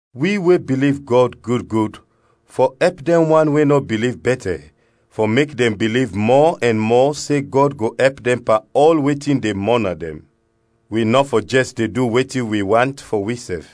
Wi we biliv Gɔd gud gud fɔ ɛp dɛn wan we nɔ biliv bɛtɛ fɔ mek dɛn biliv mɔ ɛn mɔ se Gɔd go ɛp dɛn pan ɔl wetin de mɔna dɛn. Wi nɔ fɔ jɛs de du wetin wi want fɔ wisɛf.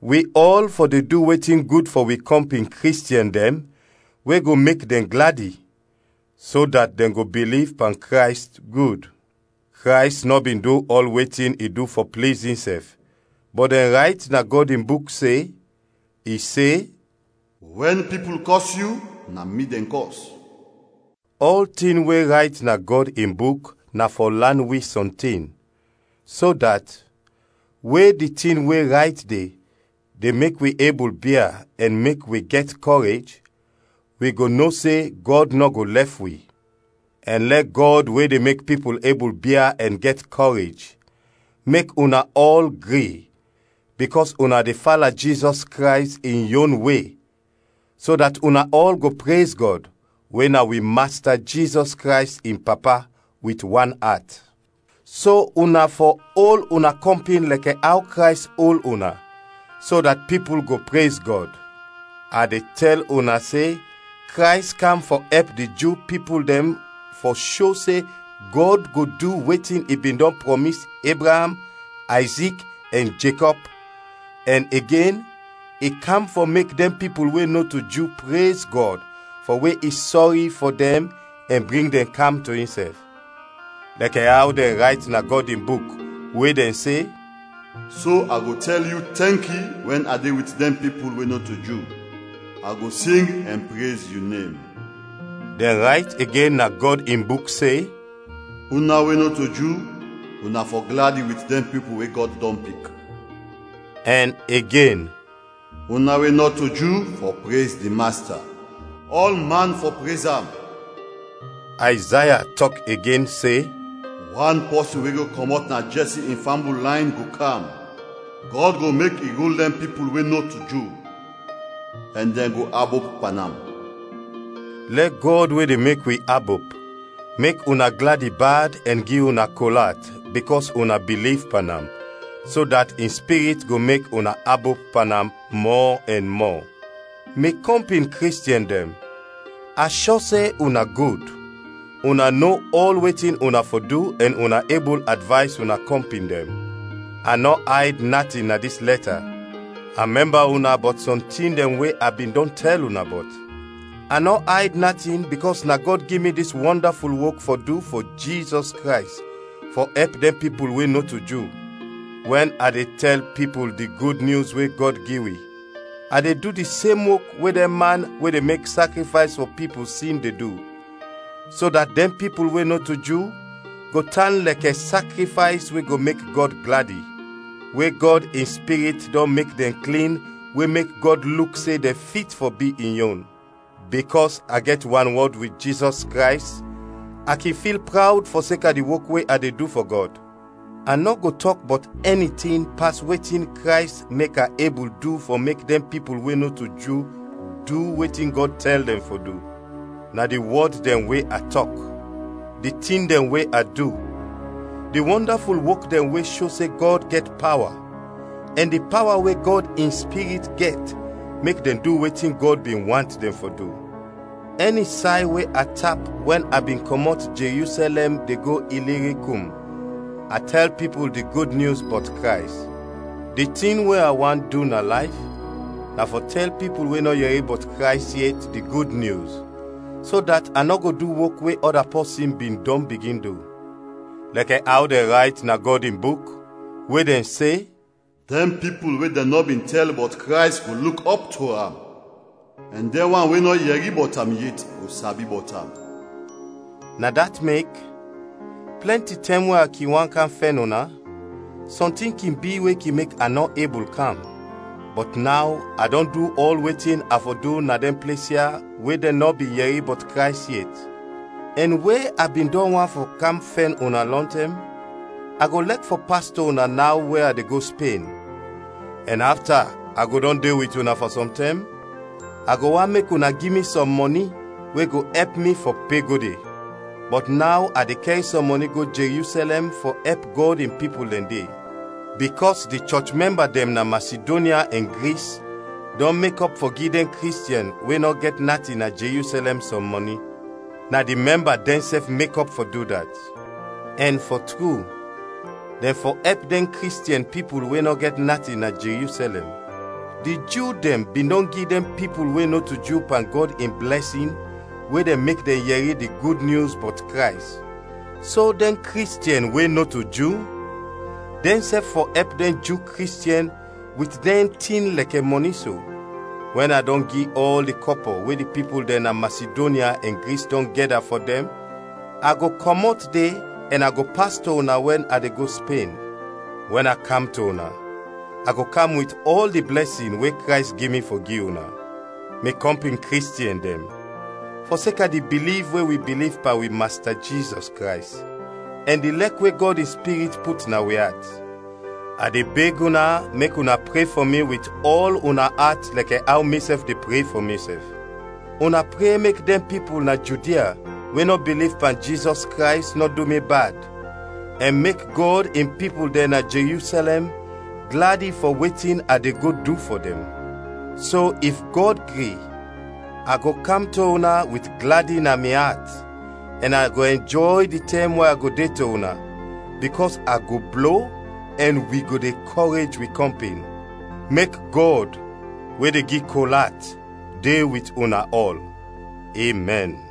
Wi ɔl fɔ de du wetin gud fɔ wi kɔmpin Kristiɛn dɛn we go mek dɛn gladi, so dat dɛn go biliv pan Krays gud. Krays nɔ bin du ɔl wetin i du fɔ pliz insɛf, bɔt dɛn rayt na Gɔd in Buk se, i se, “Wɛn pipul kɔs yu, na mi dɛn kɔs.” Ɔltin we rayt na Gɔd in Buk na fɔ lan wi sɔntin, so dat, we di tin we rayt de, de mek wi ebul bia ɛn mek wi gɛt kɔrej, wi go no se Gɔd nɔ go lɛf wi. Ɛn lɛ Gɔd we de mek pipul ebul bia ɛn gɛt kɔrej, mek una ɔl gri, bikɔs una de fala Jizɔs Krays in yon we, so dat una ɔl go prez Gɔd, we na wi Masta Jizɔs Krays in Papa, wit wan at. So una fɔ ol una kɔmpin lɛkɛ aw Krays ol una, so dat pipul go prez Gɔd. A de tɛl una se Krays kam fɔ ɛp di Ju pipul dɛn fɔ sho se Gɔd go du wetin i bin dɔn prɔmis Ebraam, Ayzik ɛn Jekɔb, ɛn igen, i kam fɔ mek dɛn pipul we nɔto Ju prez Gɔd fɔ we i sɔri fɔ dɛn ɛn bring dɛn kam to insɛf. Lɛkɛ aw dɛn rayt na Gɔd in Buk, we dɛn se, “So a go tɛl yu tɛnki wɛn a de wit dɛn pipul we nɔto Ju; a go sing ɛn prez yu nem.” Dɛn rayt igen na Gɔd in Buk se, “Una we nɔto Ju, una fɔ gladi wit dɛn pipul we Gɔd dɔn pik.” Ɛn igen, “Una we nɔto Ju, fɔ prez di Masta; ɔlman fɔ prez am!” Ayzaya tɔk igen se, “Wan pɔsin we go kɔmɔt na Jɛsi in fambul layn, go kam; Gɔd go mek i rul dɛn pipul we nɔto Ju, ɛn dɛn go abop pan am.” Lɛ Gɔd we de mek wi abop, mek una gladi bad ɛn gi una kol at bikɔs una biliv pan am, so dat in Spirit go mek una abop pan am mɔ ɛn mɔ. Mi kɔmpin Kristiɛn dɛn, a shɔ se una gud, una no ɔl wetin una fɔ du ɛn una ebul advays una kɔmpin dɛn. A nɔ ayd natin na dis lɛta, a mɛmba una bɔt sɔm tin dɛn we a bin dɔn tɛl una bɔt. A nɔ ayd natin bikɔs na Gɔd gi mi dis wɔndaful wok fɔ du fɔ Jizɔs Krays fɔ ɛp dɛn pipul we nɔto Ju. Wɛn a de tɛl pipul di Gud Nyus we Gɔd gi wi, a de du di sem wok we dɛn man we de mek sakrifays fɔ pipul sin de du, so dat dɛn pipul we nɔto Ju go tan lɛkɛ sakrifays we go mek Gɔd gladi; we Gɔd in Spirit dɔn mek dɛn klin we mek Gɔd luk se dɛn fit fɔ bi in yon. Bikɔs a gɛt wanwɔd wit Jizɔs Krays, a kin fil prawd fɔseka di wok we a de du fɔ Gɔd. A nɔ go tɔk bɔt ɛni tin pas wetin Krays mek a ebul du fɔ mek dɛn pipul we nɔto Ju du wetin Gɔd tɛl dɛn fɔ du. Na di wɔd dɛn we a tɔk, di tin dɛn we a du, di wɔndaful wok dɛn we sho se Gɔd gɛt pawa, ɛn di pawa we Gɔd in Spirit gɛt mek dɛn du wetin Gɔd bin want dɛn fɔ du. Ɛni say we a tap wɛn a bin kɔmɔt Jerusɛlɛm de go Ilirikum, a tɛl pipul di Gud Nyus bɔt Krays. Di tin we a want du na layf, na fɔ tɛl pipul we nɔ yɛri bɔt Krays yet di Gud Nyus, so dat a nɔ go du wok we ɔda pɔsin bin dɔn bigin du. Lɛkɛ aw dɛn rayt na Gɔd in Buk, we dɛn se, “Dɛn pipul we dɛn nɔ bin tɛl bɔt Krays go luk ɔp to am, ɛn dɛn wan we nɔ yɛri bɔt am yet go sabi bɔt am.” Na dat mek, plɛnti tɛm we a kin want kam fɛn una, sɔntin kin bi we kin mek a nɔ ebul kam. Bɔt naw a dɔn du ɔl wetin a fɔ du na dɛn ples ya we dɛn nɔ bin yɛri bɔt Krays yet, ɛn we a bin dɔn want fɔ kam fɛn una lɔntɛm, a go lɛk fɔ pas to una naw we a de go Spen, ɛn afta a go dɔn de wit una fɔ sɔm tɛm, a go want mek una gi mi sɔm mɔni we go ɛp mi fɔ pe go de. Bɔt naw a de kɛr sɔm mɔni go Jerusɛlɛm fɔ ɛp Gɔd in pipul dɛn de. Bikɔs di chɔch mɛmba dɛn na Masidonya ɛn Gris dɔn mekɔp fɔ gi dɛn Kristiɛn we nɔ gɛt natin na Jerusɛlɛm sɔm mɔni. Na di mɛmba dɛnsɛf mekɔp fɔ du dat. Ɛn, fɔ tru, dɛn fɔ ɛp dɛn Kristiɛn pipul we nɔ gɛt natin na Jerusɛlɛm. Di Ju dɛn bin dɔn gi dɛn pipul we nɔto Ju pan Gɔd in blɛsin we dɛn mek dɛn yɛri di Gud Nyus bɔt Krays, so dɛn Kristiɛn we nɔto Ju, dɛnsɛf fɔ ɛp dɛn Ju Kristiɛn wit dɛn tin lɛkɛ mɔni so. Wɛn a dɔn gi ɔl di kɔpɔ we di pipul dɛn na Masidonya ɛn Gris dɔn gɛda fɔ dɛn, a go kɔmɔt de ɛn a go pas to una wɛn a de go Spen. Wɛn a kam to una, a go kam wit ɔl di blɛsin we Krays gi mi fɔ gi una. Mi kɔmpin Kristiɛn dɛn, fɔseka di biliv we wi biliv pan wi Masta Jizɔs Krays, ɛn di lɛk we Gɔd in Spirit put na wi at, a de beg una mek una pre fɔ mi wit ɔl una at lɛkɛ aw misɛf de pre fɔ misɛf. Una pre mek dɛn pipul na Judia we nɔ biliv pan Jizɔs Krays nɔ du mi bad, ɛn mek Gɔd in pipul dɛn na Jerusɛlɛm gladi fɔ wetin a de go du fɔ dɛn. So if Gɔd gri, a go kam to una wit gladi na mi at, ɛn a go ɛnjɔy di tɛm we a go de to una, bikɔs a go blo ɛn wi go de kɔrej wi kɔmpin. Mek Gɔd, we de gi kol at, de wit una ɔl! Emɛn.